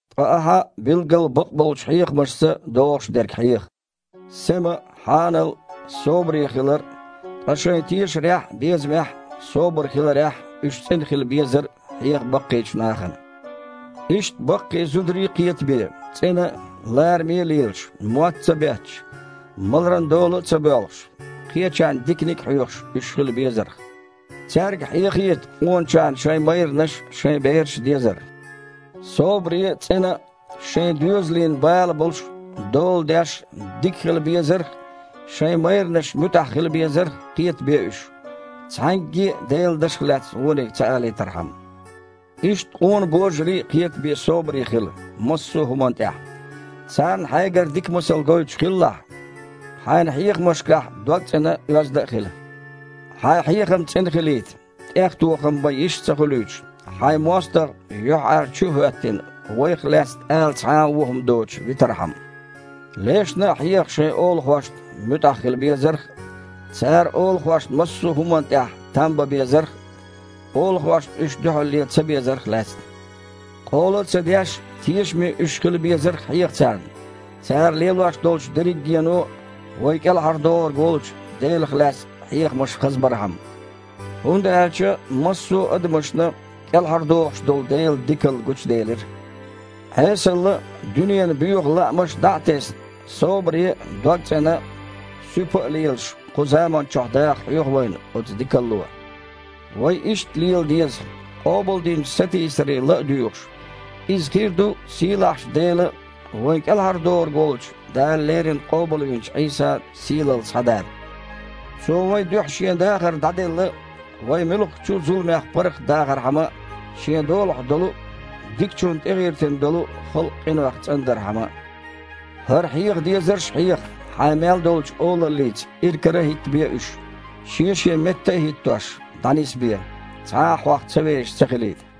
Ткъа ахьа билггал бакъболчу хьехамашца догІуш дерг хьеха. Сема а, хьанал а, собаре хилар а, ткъа шайн тешарехь а, безамехь а, собар хиларехь а уьш цІена хила безар а хьеха баккхийчу нахана. Иштта баккхий зударий а кхетабе, цІена а, лараме а лелаш, мотт а ца бетташ, маларан дола а ца боьлхуш, кхечарна диканиг а хьоьхуш, уьш хила безарх. Цаьрга хьехийта къоначарна шайн майранаш а, шайн бераш а дезар. Собаре а, цІена а, шайн доьзалийн бала болуш а, дола деш а, дика хила безарх а, шайн майранашна муьтІахь хила безарх а кхетабе уьш, цхьаьнгге а Делан дашах лаьцна вониг ца алийтархьама. Иштта къона божарий а кхетабе собаре хила массо а хІуманна тІехь. Царна хьайгара дика масал гойтуш хилалахь. Хьайн хьехамашкахь догцІена а, оьзда а хила. Хьайн хьехам цІена хилийта, тІехтохам бан йиш а ца хуьлуьйтуш, хьайн мостагІа, юьхьІаьржачу а хІоьттина, вайх лаьцна ала цхьа а вон хІума доцуш витархьама. Лешна а хьеха шайн олахошна муьтІахь хила безарх а, цара олахошна массо а хІуманна тІехь там бан безарх а, олахошна уьш дуьхьал лен ца безарх а лаьцна. Къола а ца деш, тешаме уьш хила безар а хьеха царна, цара лелош долчу дерригено а вайн КІелхьардохург волчу Делах лаьцна хьехамаш хазбархьама. ХІунда аьлча массо а адамашна кІелхьардохуш долу Делан дикалла гучуделира. Іесалла а, дуьненан боьха лаамаш а дІа а тесна, собаре а, догцІена а, суьпа а лелаш кху заманчохь даха хьоьху вайна оцу дикалло. Вай иштта лела деза, къобалдинчу сатийсаре ла а дуьйгІуш: иза хир ду сийлахьчу Делан а, вайн КІелхьардохург волчу Дала леррина къобалвинчу Іийсан а сийлалла схьадар. Цо вайн дуьхьа Шен дахар дІаделла, вай муьлххачу а зуламех паргІатдахархьама а, Шен долахь долу а, дикачунна тІегІиртина долу а халкъ къинойх цІандархьама а. ХІара хьеха дезарш а хьеха, хьайн мел долчу олаллица иракара а хІиттабе уьш, шен-шен метта а хІиттош, дІанисбе, цхьа а хьох ца вешаш ца хилийта.